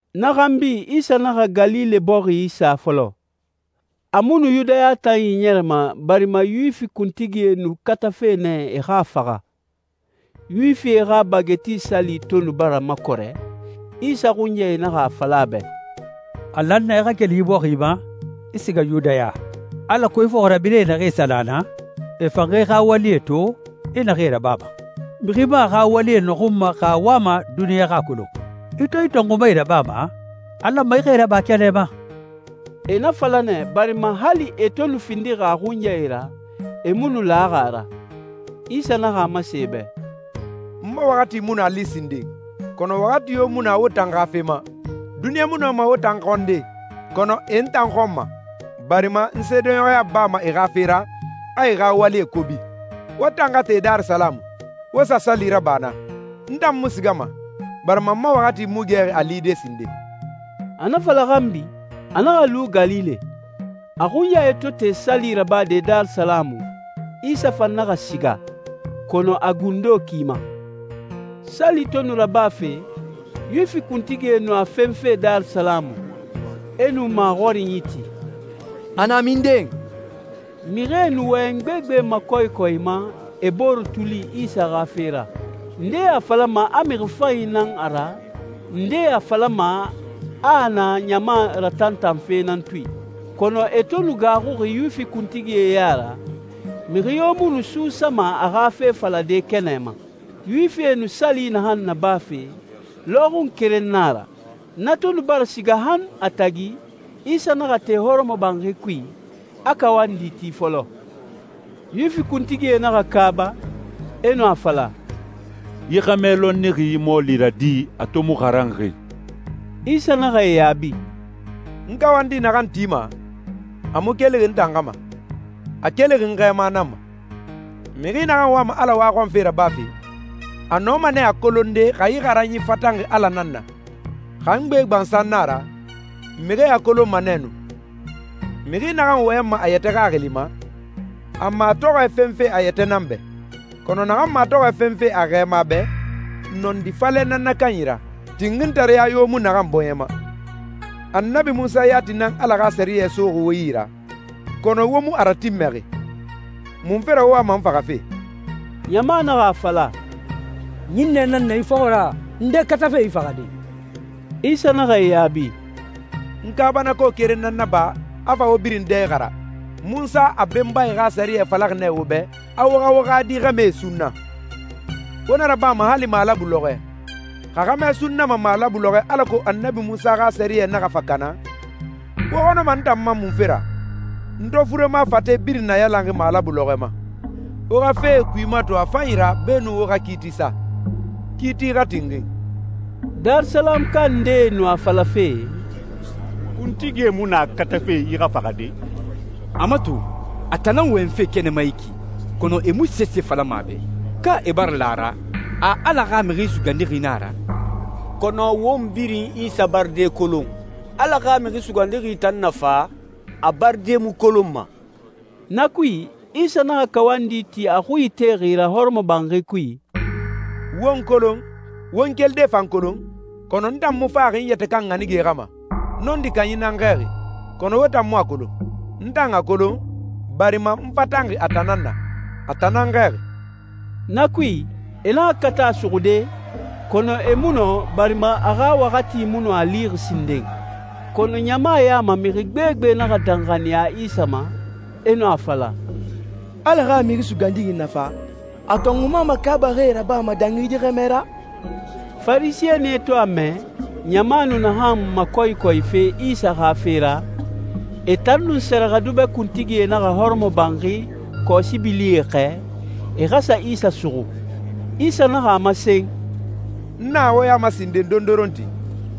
Na xanbi, Isa naxa Galile bɔxi isa fɔlɔ. A mu nu Yudaya tan iɲɛrɛma, barima Yuwifi kuntigie nu katafe nɛ e xa a faxa. Yuwifie xa Bage Ti Sali to nu bara makɔrɛ, Isa xunyae naxa a fala a bɛ, «A lan nɛ i xa keli yi bɔxi ma, i siga Yudaya, alako i fɔxirabirɛe naxee sa na naa, e fan xa i xa walie to, i naxee rabama. Mixi mu a xa wali nɔxunma xa a wama duniɲa xa a kolon. I to yi tɔnxumae rabama, a lanma i xa e raba kɛnɛ ma.» E na fala nɛ, barima hali e to findixi a xunyae ra, e mu nu laxi a ra. Isa naxa a masen e bɛ, «N ma waxati mu nu a li sinden, kɔnɔ waxati yo mu na wo tan xa fe ma. Duniɲa mu nɔma wo tan xɔnde, kɔnɔ e n tan xɔnma, barima n seedeɲɔxɔya bama e xa fe ra, a e xa walie kobi. Wo tan xa te Darisalamu, wo sa sali raba naa. N tan mu sigama, barima n ma waxati mu gɛxi a lide sinden.» A na fala xanbi, a naxa lu Galile. A xunyae to te sali rabade Darisalamu, Isa fan naxa siga, kɔnɔ a gundo ki ma. Sali to nu rabafe, Yuwifi kuntigie nu a fenfe Darisalamu, e nu maxɔrinyi ti, «A na minden?» Mixie nu wɔyɛn gbegbe makɔyikɔyima e bore tuli Isa xa fe ra. Ndee a falama a mixi fanyi nan a ra, ndee a falama a a na ɲama ratantanfe nan tui. Kɔnɔ e to nu gaaxuxi Yuwifi kuntigie ya ra, mixi yo mu nu suusama a xa fe falade kɛnɛ ma. Yuwifie nu sali naxan nabafe, lɔxun keren na a ra. Na to nu bara siga han a tagi, Isa naxa te hɔrɔmɔbanxi kui, a kawandi ti fɔlɔ. Yuwifi kuntigie naxa kaaba, e nu a fala, «Yi xɛmɛ lɔnnixi yi mɔɔli ra di, a to mu xaranxi?» Isa naxa e yaabi, «N kawandi naxan tima, a mu kelixi n tan xa ma. A kelixi n Xɛɛma nan ma. Mixi naxan wama Ala waxɔnfe rabafe, a nɔma nɛ a kolonde xa yi xaranyi fatanxi Ala nan na. Xa n gbe gbansan na a ra, mixie a kolonma nɛ nu. Mixi naxan wɔyɛnma a yɛtɛ xaxili ma, a matɔxɔɛ fenfe a yɛtɛ nan bɛ. Kɔnɔ naxan matɔxɔɛ fenfe a Xɛɛma bɛ, nɔndi falɛ nan na kanyi ra, tinxintareya yo mu naxan bɔɲɛ ma. Annabi Munsa yati nan Ala xa sɛriyɛ soxi wo yi ra, kɔnɔ wo mu a ratinmɛxi. Munfe ra wo wama n faxafe?» Ɲama naxa a fala, «Ɲinnɛ nan na i fɔxɔ ra! Nde katafe i faxade?» Isa naxa e yaabi, «N kaabanako keren nan naba, a fa wo birin dɛ ixara. Munsa a benbae xa sɛriyɛ falaxi nɛ wo bɛ a wo xa wo xa di xɛmɛe sunna. Wo na rabama hali malabu lɔxɔɛ. Xa xɛmɛ sunnama malabu lɔxɔɛ alako Annabi Munsa xa sɛriyɛ naxa fa kana, wo xɔnɔma n tan ma munfe ra, n to furema fate birin nayalan malabu lɔxɔɛ ma? Wo xa fee kui mato a fanyi ra beenun wo xa kiiti sa. Kiiti xa tinxin.» Darisalamuka ndee nu a falafe, «Kuntigie mu na katafe yi xa faxade? A mato, a tan nan wɔyɛnfe kɛnɛ ma yi ki, kɔnɔ e mu sese falama a bɛ! Ka e bara la a ra, a Ala xa Mixi Sugandixi na a ra? Kɔnɔ won birin Isa baride kolon. Ala xa Mixi Sugandixi tan na fa, a baride mu kolonma.» Na kui, Isa naxa kawandi ti a xui itexi ra hɔrɔmɔbanxi kui, «Wo n kolon, wo n kelide fan kolon? Kɔnɔ n tan mu faxi n yɛtɛ kan ɲanige xa ma. Nɔndi Kanyi nan n xɛɛxi, kɔnɔ wo tan mu a kolon. N tan a kolon, barima n fatanxi a tan nan na. A tan nan n xɛɛxi.» Na kui, e naxa kata a suxude, kɔnɔ e mu nɔ, barima a xa waxati mu nu a lixi sinden. Kɔnɔ ɲama ya ma mixi gbegbe naxa danxaniya Isa ma, e nu a fala, «Ala xa Mixi Sugandixi na fa, a tɔnxuma makaabaxie rabama dangi yi xɛmɛ ra?» Farisɛnie to a mɛ, ɲama nu naxan makɔyikɔyife Isa xa fe ra, e tan nun sɛrɛxɛdubɛ kuntigie naxa hɔrɔmɔbanxi kɔsibilie xɛɛ, e xa sa Isa suxu. Isa naxa a masen, «N na wo ya ma sinden dondoronti,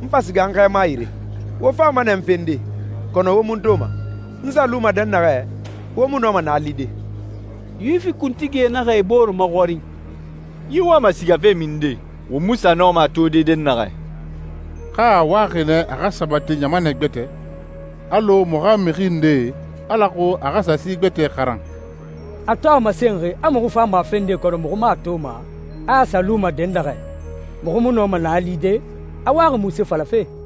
n fa siga n Xɛɛma yire. Wo fama nɛ n fende, kɔnɔ wo mu n toma. N sa luma dɛnnaxɛ, wo mu nɔma naa lide.» Yuwifi kuntigie naxa e bore maxɔrin, «Yi wama sigafe minden, won mu sa nɔma a tode dɛnnaxɛ? Ka a waxi nɛ a xa sa sabati ɲamanɛ gbɛtɛ alɔ muxu xa mixi ndee, alako a xa sa si gbɛtɛe xaran? A to a masenxi a muxu fama a fende kɔnɔ muxu mu a toma, a a sa luma dɛnnaxɛ, muxu mu nɔma naa lide, a waxi munse falafe?»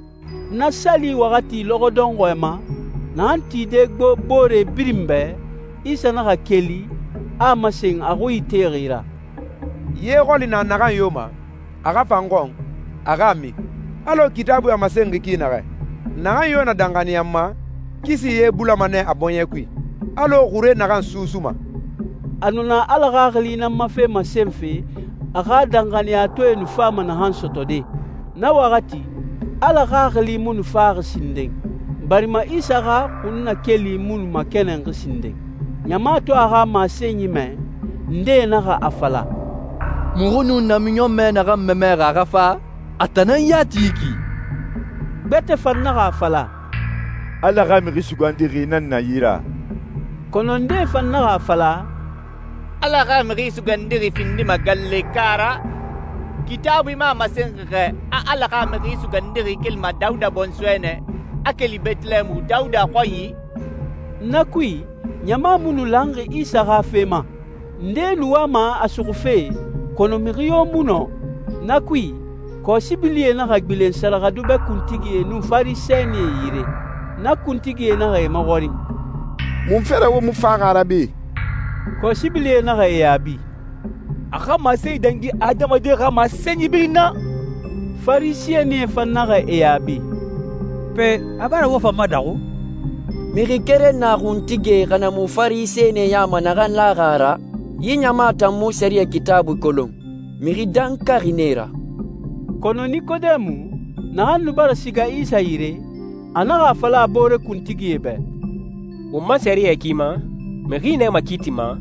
Na sali waxati lɔxɔ dɔnxɔɛ ma, naxan tide gbo boore birin bɛ, Isa naxa keli, a a masen a xui itexi ra, «Ye xɔli na naxan yo ma, a xa fa n xɔn, a xa a min. Alɔ Kitaabui a masenxi ki naxɛ, naxan yo na danxaniya n ma, kisi ye bulama nɛ a bɔɲɛ kui, alɔ xure naxan susuma.» A nu na Ala Xaxili nan ma fe masenfe, a xa danxaniyatɔɛe nu fama naxan sɔtɔde. Na waxati, Ala Xaxili mu nu faxi sinden, barima Isa xa xunnakeli mu nu makɛnɛnxi sinden. Ɲama to a xa masenyi mɛ, ndee naxa a fala, «Muxu nu namiɲɔnmɛ naxan mamɛxi a xa fa, a tan nan yati yi ki!» Gbɛtɛ fan naxa a fala, «Ala xa Mixi Sugandixi nan na yi ra!» Kɔnɔ ndee fan naxa a fala, «Ala xa Mixi Sugandixi findima Galileka ra? Kitaabui mu a masenxi xɛ, a Ala xa Mixi Sugandixi kelima Dawuda bɔnsɔɛ nɛ, a keli Bɛtɛlɛɛmu, Dawuda xɔnyi?» Na kui, ɲama mu nu lanxi Isa xa fe ma. Ndee nu wama a suxufe, kɔnɔ mixi yo mu nɔ. Na kui, kɔsibilie naxa gbilen sɛrɛxɛdubɛ kuntigie nun Farisɛnie yire. Na kuntigie naxa e maxɔrin, «Munfe ra wo mu faxi a ra be?» Kɔsibilie naxa e yaabi, «A xa masenyi dangi adamadie xa masenyi birin na.» Farisɛnie fan naxa e yaabi, «Pe, a bara wo fan madaxu? Mixi keren na kuntigie xa na mu Farisɛnie ya ma naxan laxi a ra? Yi ɲama tan mu sɛriyɛ Kitaabui kolon. Mixi dankaxie nan e ra.» Kɔnɔ Nikodemu, naxan nu bara siga Isa yire, a naxa a fala a boore kuntigie bɛ, «Won ma sɛriyɛ ki ma, mixi nɛ makiitima,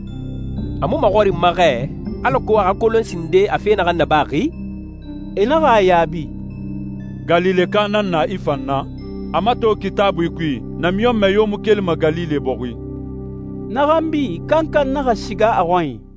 a mu maxɔrinma xɛ alako a xa kolon sinden a fe naxan nabaxi?» E naxa a yaabi, «Galileka nan na i fan na? A mato Kitaabui kui, namiɲɔnmɛ yo mu kelima Galile bɔxi!» Na xanbi, kankan naxa siga a xɔnyi.